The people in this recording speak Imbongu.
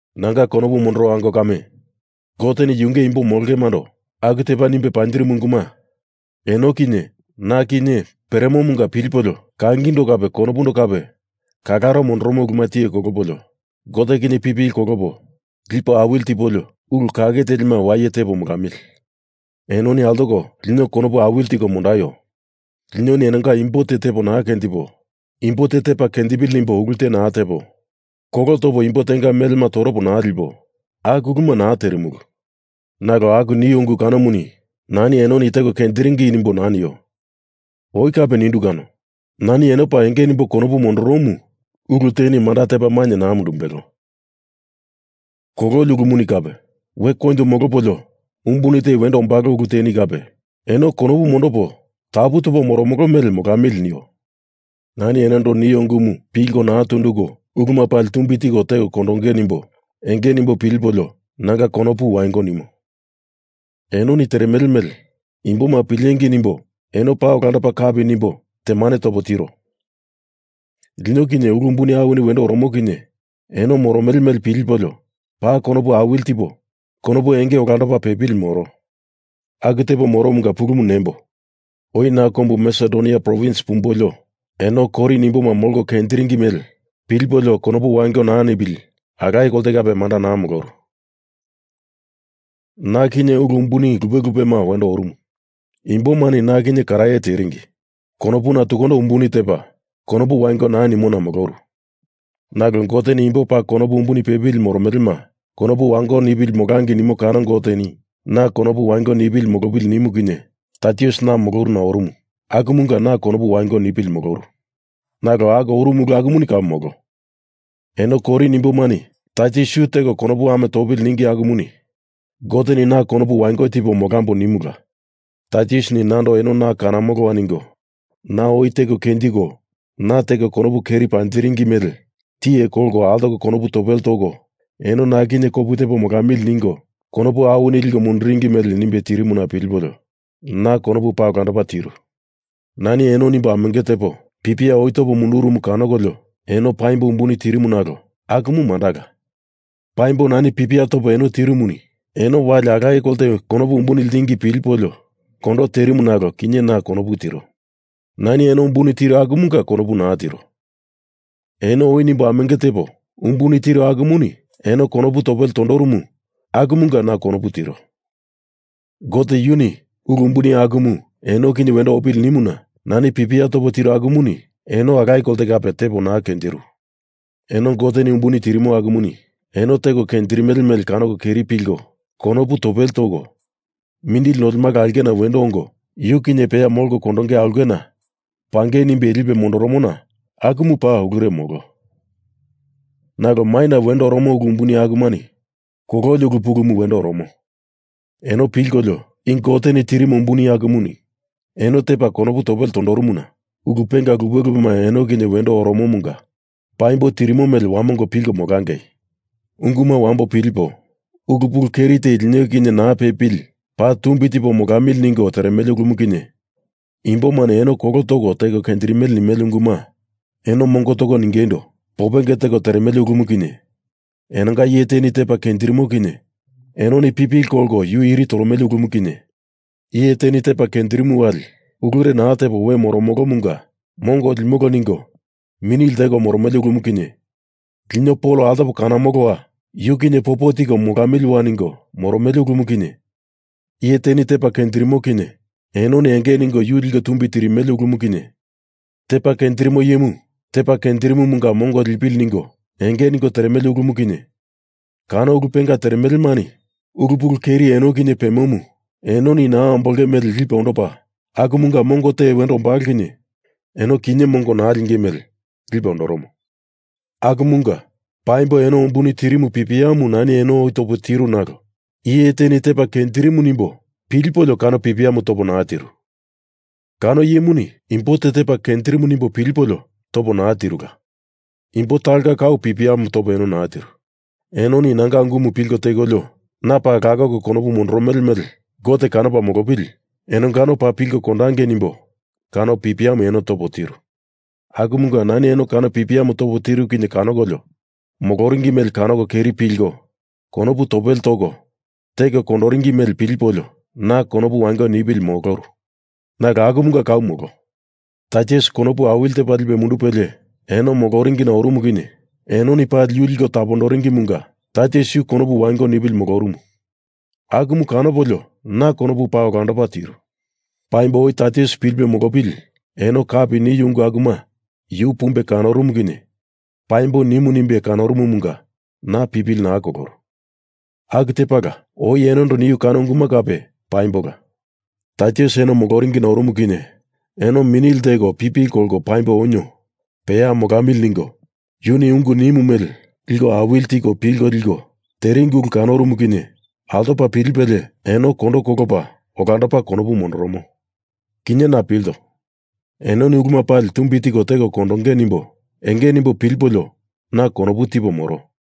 Nanga konopu mondoro ango kame, Goteni yunge imbo molongemando aku tepa nimbe panjirimu unguma eno kinye na kinye peremomunga pilipolio, kangindo kape konopundo kape kalaro mondoromo uluma tiye kolopo, Gote kinye pipili kolopo lipo awili tipolio ulu kake telima waye tepo molamili. Enoni altoko lino konopu awili tiko mondaio! Linoni enonga imbo te tepo naa kenjipo, imbo te tepa kenjipili nimbo ulu te naa tepo, kolo topo imbo tenga melema toropo naa lipo, aku uluma naa terimulu. Nalo aku nio ungu kanomuni nani enoni teko kenjiringi nimboi naa nio. Oi kape nindu kano, nani eno paa enge nimbo konopu mondoromu ulu teni manda tepa mainye naa mundumbelo, kololi ulumuni kape, we koinjo molopolio umbuni te wendo ombalo ulu teni kape, eno konopu mondopo tapu topo moromolo mele molamili nio. Nani enondo nio ungumu pilko naa tunduko uluma pali tumbi tiko teko kondonge nimbo enge nimbo pilipolio nanga konopu wango nimo. Enoni teremele mele imboma pilengei nimbo eno paa olandopa kapi nimbo temane topo tiro. Lino kinye ulu umbuni awini wendo oromo kinye eno moromele mele pilipolio paa konopu awili tipo konopu enge olandopa pepili moro. Aku tepo moromunga pulumu nembo. Oi na kombu Masedonia provins pumbolio, eno Korin imboma molko kenjiringi mele pilipolio konopu wango naa nipili alaye kolte kape manda naa moloru. Na kinye ulu umbuni lupe lupema wendo orumu. Imbomani na kinye karaye teringi. Konopuna tukundo umbuni tepa konopu wango naa nimona moloru. Nalo Goteni imbo paa konopu umbuni pepili moromelema konopu wango nipili molangei nimo kano Goteni na konopu wango nipili molopili nimu kinye Taitus na moloruna orumu akumunga na konopu wango nipili moloru. Nalo aku orumu ulumuni kau molo. Eno Korin imbomani Taitus yu teko konopu ame topili ningi akumuni Goteni na konopu wango tipo molambo nimula. Taitusini nando eno na kanamoloa ningo, na oi teko kenjiko, na teko konopu keri panjindiringi mele tiye kolko altoko konopu topele toko eno na kinye kopu tepo molamili ningo konopu awini liko munduringi mele nimbe tirimuna pilipolio na konopu paa olandopa tiru. Nani eno nimbo amenge tepo pipia oi topo mundurumu kanokolio eno paimbo umbuni terimu nalo akumu mandala. Paimbo nani pipia topo eno tirumuni eno wali alaye kolte konopu umbuni ltingi kinye pilipolio kondo terimu nalo kinye na konopu tiro. Nani eno umbuni tiru akumunga konopu naa tiro. Eno oi nimbo amenge tepo umbuni tiru akumuni eno konopu topele tondorumu akumunga na konopu tiro. Gote yuni ulu umbuni akumu eno kinye wendo opili nimuna nani pipia topo tiru akumuni eno alaye kolte kape tepo naa kenjiru. Eno Goteni umbuni tirimo akumuni eno teko kenjirimele mele kanoko keri pilko konopu topele toko, mindili nolemala aulkena wendo ongo, yu kinye peya molko kondonge aulkena pangei nimbe lipe mondoromona akumu paa, ulure molo. Nalo maina wendo oromo ulu umbuni akumani kololi ulu pulumu wendo oromo. Eno pilkolio, i Goteni tirimo umbuni akumuni eno tepa konopu topele tondorumuna ulu penga lupe lupema eno kinye wendo oromomunga paimbo tirimo mele wamongo pilko molangei. Unguma wambo pilipo, ulu pulu keri te lino kinye naa pepili paa tumbi tipo molamili ningo teremele ulumu kinye, imbomani eno kolo toko teko kenjirimele nimele unguma eno mongo toko ningeindo popenge teko teremele ulumu kinye, enonga iye teni tepa kenjirimo kinye enoni pipili kolko yu iri toromele ulumu kinye, iye teni tepa kenjirimu wali ulure naa tepo we molorumulumunga mongo limolo ningo mini lteko moromele ulumu kinye, lino Pol altopo kanomoloa, yu kinye popo tipo molamilia ningo moromele ulumu kinye, iye teni tepa kenjirimo kinye enoni enge ningo yu liko tumbi tirimele ulumu kinye, tepa kenjirimo iyemu tepa kenjirimomunga mongo lipili ningo enge ningo teremele ulumu kinye, kano ulu penga teremelemani ulu pulu keri eno kinye pemomu enoni naa ambolonge mele lipe ondopa, akumunga mongo te wendo ombalo kinye eno kinye mongo naa linge mele lipe ondoromo. Akumunga, paimbo eno umbuni tirimu pipiamu nani oi topo tiru nalo iye teni tepa kenjirimu nimbo pilipolio kano pipiamu topo naa tiru. Kano iyemuni imbo te tepa kenjirimu nimbo pilipolio topo naa tirula. Imbo talonga kau pipia topo eno naa tiru. Enoni nanga ungumu pilko tekolio na paa lakoko konopu mondoromele mele Gote kanopa molopili enongano paa pilko kondangei nimbo kano pipiamu eno topo tiru. Akumunga nani eno kano pipiamu topo tiru kinye kanokolio moloringi mele kanoko keri pilko konopu topele toko teko kondoringi mele pilipolio na konopu wango nipili moloru. Nalo akumunga kau molo. Taitus konopu awili tepa lipe mundupelie eno moloringina orumu kinye enoni pali yu liko tapondoringimunga Taitus yu konopu wango nipili molorumu akumu kanopolio na konopu paa olandopa tiru Paimbo oi Taitus pilipe molopili eno kapi niu ungu akuma yu pumbe kanorumu kinye paimbo nimu nimbe kanorumumunga na pipili naa koloru. Aku tepala oi enondo niu kano unguma kape paimbola. Taitus eno moloringina orumu kinye eno mini lteko pipili kolko paimbo onio, peya molamili ningo, yuni ungu nimu mele liko awili tiko pilko liko teringi ulu kanorumu kinye altopa pilipelie eno kondo kolopa olandopa konopu mondoromo. Kinye na pilto, enoni uluma pali tumbi tiko teko kondonge nimbo enge nimbo pilipolio na konopu tipo moro.